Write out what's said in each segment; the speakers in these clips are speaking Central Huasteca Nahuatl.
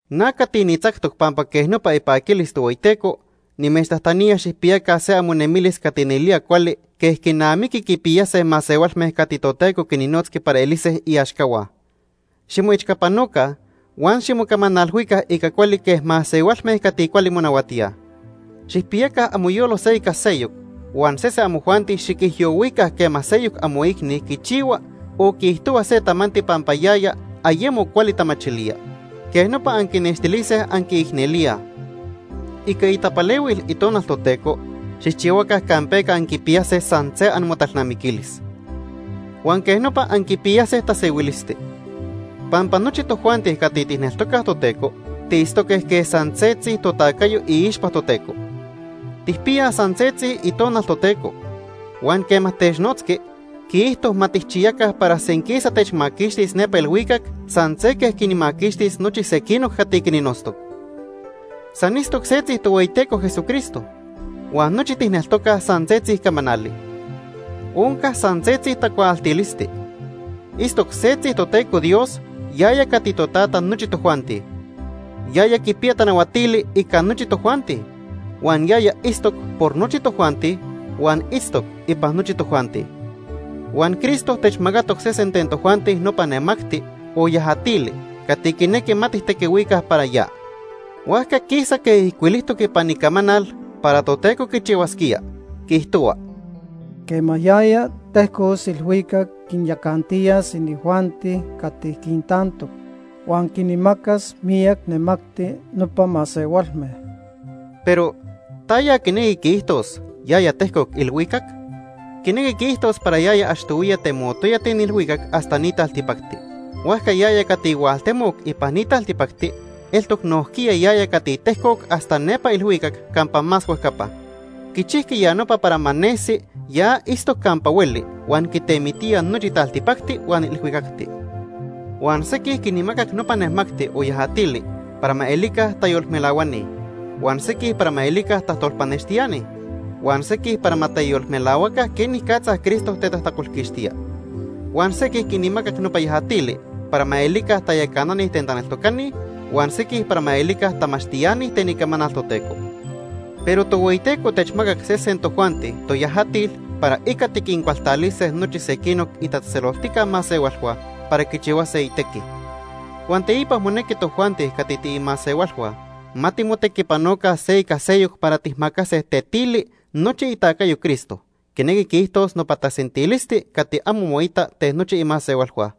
Na cati nitzactoc pampa quej nopa ipaquilis Tohueyiteco, nimechtajtanía xijpiyaca se amonemilis cati nelía cuali quej quinamiqui quipiyase masehualme cati Toteco quinnotzqui para elise iaxcahua. Ximoechcapanoca huan ximocamanalhuica ica cuali quej masehualme cati cuali monahuatíaj. Xijpiyaca amoyolo se ica seyoc, huan sese amojuanti xiquijyohuica quema seyoc amoicni quichihua o quiijtohua se tamanti pampa yaya ayemo cuali tamachilía. Quej nopa anquinextilise anquiicnelíaj. Ica itapalehuil Itonal Toteco xijchihuaca campeca anquipiyase san se amotalnamiquilis. Huan quej nopa anquipiyase tasehuilisti. Pampa nochi tojuanti cati tijneltocaj Toteco tiitztoque quej san setzi totacayo iixpa Toteco. Tijpiyaj san setzi Itonal Toteco. Huan quema technotzqui, quiijto ma tijchiyaca para senquisa techmaquixtis nepa ilhuicac san se quej quinmaquixtis nochi sequinoc cati quinnotztoc. San itztoc setzi Tohueyiteco Jesucristo. Huan nochi tijneltocaj san setzi camanali. Onca san setzi tacuaaltilisti. Itztoc setzi Toteco Dios, yaya cati Totata nochi tojuanti. Yaya quipiya tanahuatili ica nochi tojuanti. Huan yaya itztoc por nochi tojuanti, huan itztoc ipan nochi tojuanti. Huan Cristo techmacatoc sesen ten tojuanti nopa nemacti o yajatili cati quinequi ma tijtequihuica para ya. Huajca quisa quej ijcuilijtoc ipan Icamanal para Toteco quichihuasquía, quiijtohua: “Quema yaya tejcos ilhuicac quinyacantiyas inijuanti cati quintantoc. Huan quinmacas miyac nemacti nopa masehualme.” Pero ¿taya quinequi quiijtos “yaya tejcoc ilhuicac”? Quinequi quiijtos para yaya achtohuiya temotoya ten ilhuicac hasta ni taltipacti. Huajca yaya cati hualtemoc ipan ni taltipacti eltoc nojquiya yaya cati tejcoc hasta nepa ilhuicac campa más huejcapa. Quichijqui ya nopa para ma nesi ya itztoc campa hueli huan quitemitía nochi taltipacti huan ilhuicacti. Huan sequij quinmacac nopa nemacti o yajatili para ma elica tayolmelahuani, huan sequij para ma elica tajtolpanextiani, huan sequij para ma teyolmelahuaca quenicatza Cristo tetajtacolquixtía. Huan sequij quinmacac nopa yajatili para ma elica tayacanani ten taneltocani huan sequij para ma elica tamachtiani ten Icamanal Toteco. Pero Tohueyiteco techmacac sesen tojuanti toyajatil para ica tiquincualtalise nochi sequinoc itatzejtzeloltijca masehualhua para quichihuase itequi. Huan teipa monequi tojuanti cati tiimasehualhua ma timotequipanoca se ica seyoc para tijmacase tetili nochi itacayo Cristo, quinequi quiijtos nopa tasentilisti cati amo moita ten nochi imasehualhua.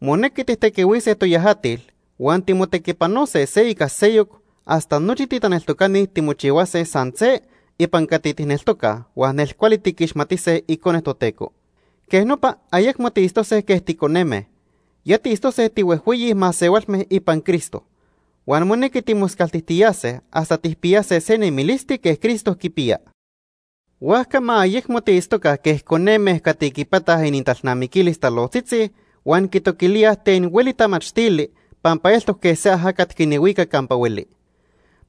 Monequi tijtequihuise toyajatil huan timotequipanose se ica seyoc hasta nochi titaneltocani timochihuase san se ipan cati tijneltocaj huan nelcuali tiquixmatise Icone Toteco. Quej nopa ayecmo tiitztose quej ticoneme. Ya tiitztose tihuejhueyi masehualme ipan Cristo. Huan monequi timoscaltijtiyase hasta tijpiyase se nemilisti quej Cristo quipiya. Huajca ma ayecmo tiitztoca quej coneme cati quipataj inintalnamiquilis talojtzitzi huan quitoquilíaj ten hueli tamachtili pampa eltoc quej se ajacat quinhuica campa hueli.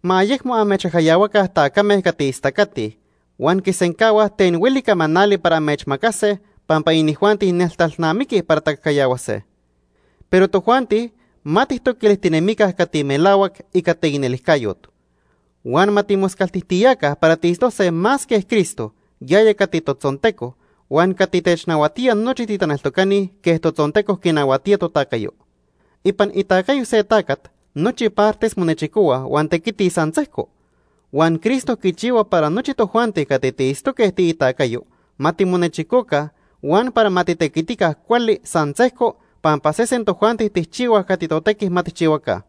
Ma ayecmo amechcajcayahuaca tacame cati istacatij huan quisencahuaj ten hueli camanali para amechmacase, pampa inijuanti neltalnamiquij para tacajcayahuase. Pero tojuanti ma tijtoquilijtinemica cati melahuac ica taicnelijcayot. Huan ma timoscaltijtiyaca para tiitztose más quej Cristo, yaya cati totzonteco, huan cati technahuatía nochi titaneltocani quej totzonteco quinahuatía totacayo. Ipan itacayo se tacat nochi partes monechicohuaj huan tequitij san sejco. Huan Cristo quichihua para nochi tojuanti cati tiitztoque tiitacayo ma timonechicoca huan para ma titequitica cuali san sejco pampa sesen tojuanti tijchihuaj cati totequi ma tijchihuaca.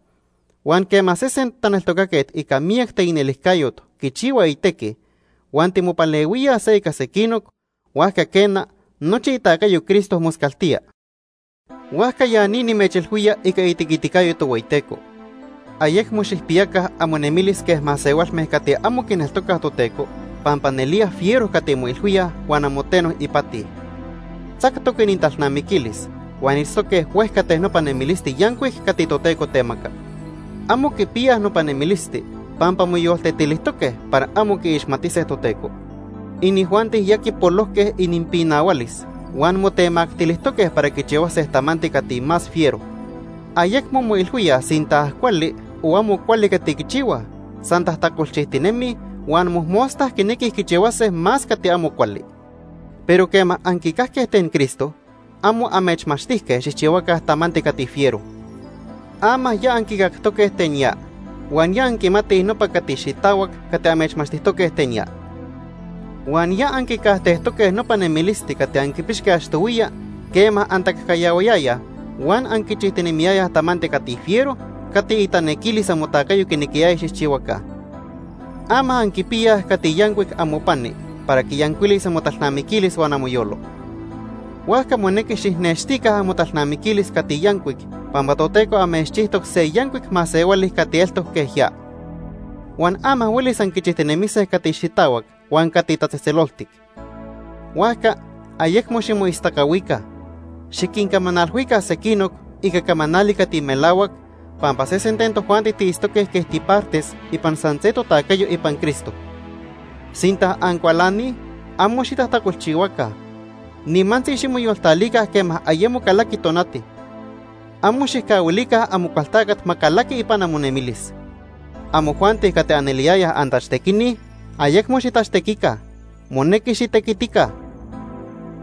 Huan quema sesen taneltocaquet ica miyac teicnelijcayot quichihua itequi huan timopalehuíaj se ica sequinoc, huajca quena, nochi itacayo Cristo moscaltía. Huajca ya ni nimechilhuía ica itequiticayo Tohueyiteco. Ayecmo xijpiyaca amonemilis quej masehualme cati amo quineltocaj Toteco pampa nelía fiero cati moilhuíaj huan amo teno ipati. Tzactoc inintalnamiquilis huan itztoque huejca ten nopa nemilisti yancuic cati Toteco temaca. Amo quipiyaj nopa nemilisti pampa moyoltetilijtoque para amo quiixmatise Toteco. Inijuanti ya quipolojque ininpinahualis huan motemactilijtoque para quichihuase tamanti cati más fiero. Ayecmo moilhuíaj sinta cuali o amo cuali cati quichihuaj, san tajtacolchijtinemij, huan mojmosta quinequij quichihuase más cati amo cuali. Pero quema anquicajque ten Cristo, amo amechmachtijque xijchihuaca tamanti cati fiero. Ama ya anquicactoque ten ya, huan ya anquimatij nopa cati xitahuac cati amechmachtijtoque ten ya. Huan ya anquicajtejtoque nopa nemilisti cati anquipixque achtohuiya quema antacajcayahuayayaj huan anquichijtinemiyayaj tamanti cati fiero cati itanequilis amotacayo quinequiyaya xijchihuaca. Ama anquipiyaj cati yancuic amopani para quiyancuilis amotalnamiquilis huan amoyolo. Huajca monequi xijnextica amotalnamiquilis cati yancuic pampa Toteco amechchijtoc se yancuic masehuali cati eltoc quej ya. Huan ama huelis anquichijtinemise cati xitahuac huan cati tatzejtzeloltic. Huajca ayecmo ximoistacahuica. Xiquincamanalhuica sequinoc ica camanali cati melahuac pampa sesen ten tojuanti tiitztoque quej tipartes ipan san se totacayo ipan Cristo. Sinta ancualanij, amo xitajtacolchihuaca. Nimantzi ximoyoltalica quema ayemo calaqui tonati. Amo xijcahuilica Amocualtacat ma calaqui ipan amonemilis. Amojuanti cati aneliyayaj antachtequini, ayecmo xitachtequica. Monequi xitequitica.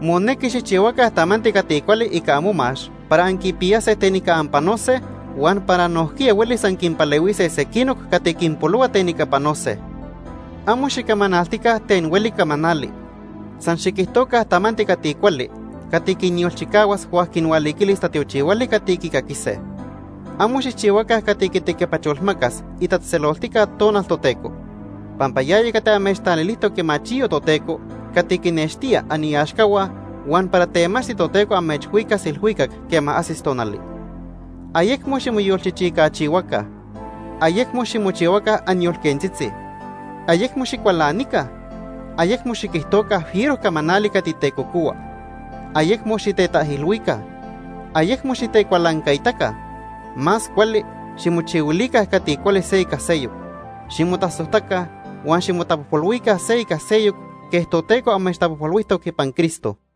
Monequi xijchihuaca tamanti cati cuali ica amomax para anquipiyase ten ica anpanose huan para nojquiya huelis anquinpalehuise sequinoc cati quinpolohua ten ica panose. Amo xicamanaltica ten hueli camanali. San xiquijtoca tamanti cati cuali cati quinyolchicahuas huan quinhualiquilis tatiochihuali cati quicaquise. Amo xijchihuaca cati quitequipacholmacas itatzejtzeloltica Tonal Toteco. Pampa yaya cati amechtalilijtoc imachiyo Toteco cati quinextía aniaxcahua huan para temachti Toteco amechhuicas ilhuicac quema ajsis tonali. Ayecmo ximoyolchichicachihuaca. Ayecmo ximochihuaca anyolquentzitzi. Ayecmo xicualanica. Ayecmo xiquijtoca fiero camanali cati tecocohua. Ayecmo xitetaijilhuica. Ayecmo xitecualancaitaca. Más cuali ximochihuilica cati cuali se ica seyoc. Ximotasojtaca huan ximotapojpolhuica se ica seyoc quej Toteco amechtapojpolhuijtoc ipan Cristo.